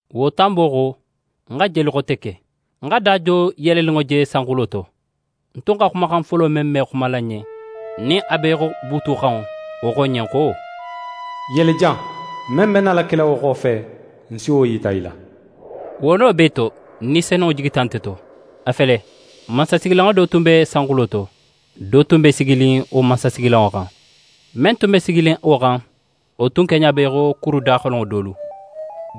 Wo tanbo xo, ń xa jeli xote ke: Ń xa da do yeleninŋo je sanxulo to. Ń tun xa xumaxan folo men me xumala ń ɲen, nin a be í xo buutu xanŋo, wo xo ń ɲen xo: «Yele jan, men be nala kela wo xofe, ń si wo yita í la.» Wo no bee to, Ni Senunŋo jigita nte to. A fele, mansasigilanŋo do tun be sanxulo to. Do tun be siginin wo mansasigilanŋo xan. Men tun be siginin wo xan, wo tun keɲa be í xo kuru daxolenŋo dolu: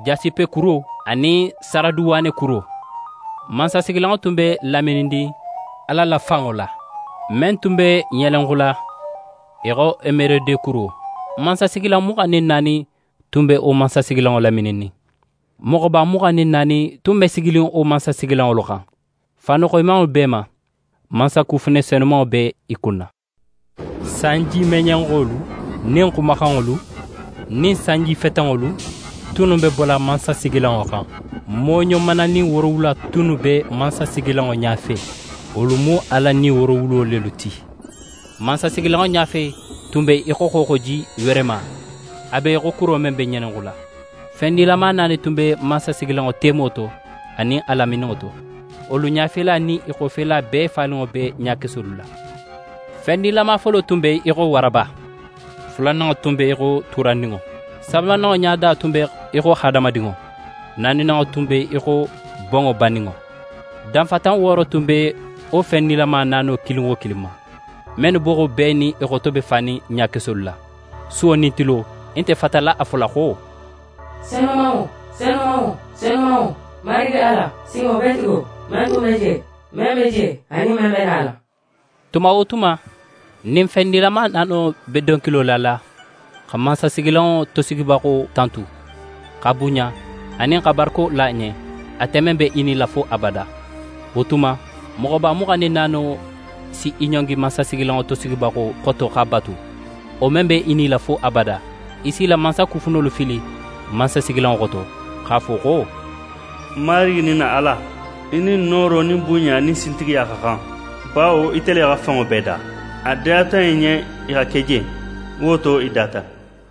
Jasipekuro anin saraduwanekuro. Mansasigilanŋo tun be lamininnin Ala la fanŋo la, men tun be ŋelenxula í xo emerodekuro. Mansasigilan muxan nin naani tun be wo mansasigilanŋo lamininnin. Moxoba muxan nin naani tunnu be siginin wo mansasigilanŋolu xan. Faanu xoyimanŋolu b'e ma. Mansakufune sanuma be i kunna. Sanjimeɲenxolu nin xumaxanŋolu nin sanjifetenŋolu tunnu be bola mansasigilanŋo xan. Mooɲo mananin woorowula tunnu be mansasigilanŋo ɲafe: Wolu mu Ala Ni woorowulo lelu ti. Mansasigilanŋo ɲafe tun be í xo xooxoji weerema, a be í xo kuro men be ŋelenxula. Fen nilama naani tunnu be mansasigilanŋo temo to anin a lamininŋo to. Wolu ɲafela nin i xofela bee faninŋo be ɲakesolu la. Fen nilama folo be í xo waraba, fulananŋo be í xo tuurandinŋo, sabananŋo ɲada be í xo hadamadinŋo, naaninanŋo be í xo bonŋo baninŋo. Danfatan wooro tun be wo fen nilama naano kilin wo kilin ma, mennu boxo bee nin i xoto be fanin ɲakesolu la. Suwo nin tilo, i nte fatala a fola xo: «Senumanŋo, senumanŋo, senumanŋo, Marigi Ala, Sinŋobeetigo, men tun be je, men be je, anin men be nala.» Tuma wo tuma, nin fen nilama naano be donkilo lala xa mansasigilanŋo tosigibaxo tantu, x'a bunɲa anin xa barako la a ɲen, ate men be í nila fo abada, wo tuma, moxoba muxan nin naano si i ɲongi mansasigilanŋo tosigibaxo xoto x'a batu, wo men be í nila fo abada. I si i la mansakufunolu fili mansasigilanŋo xoto x'a fo xo: «N Marigi nin n na Ala, í nin nooro nin bunɲa nin sintigiya xa xan; bawo ite le xa fenŋo bee da. A diyata í ɲen i xa ke je, wo to i data.»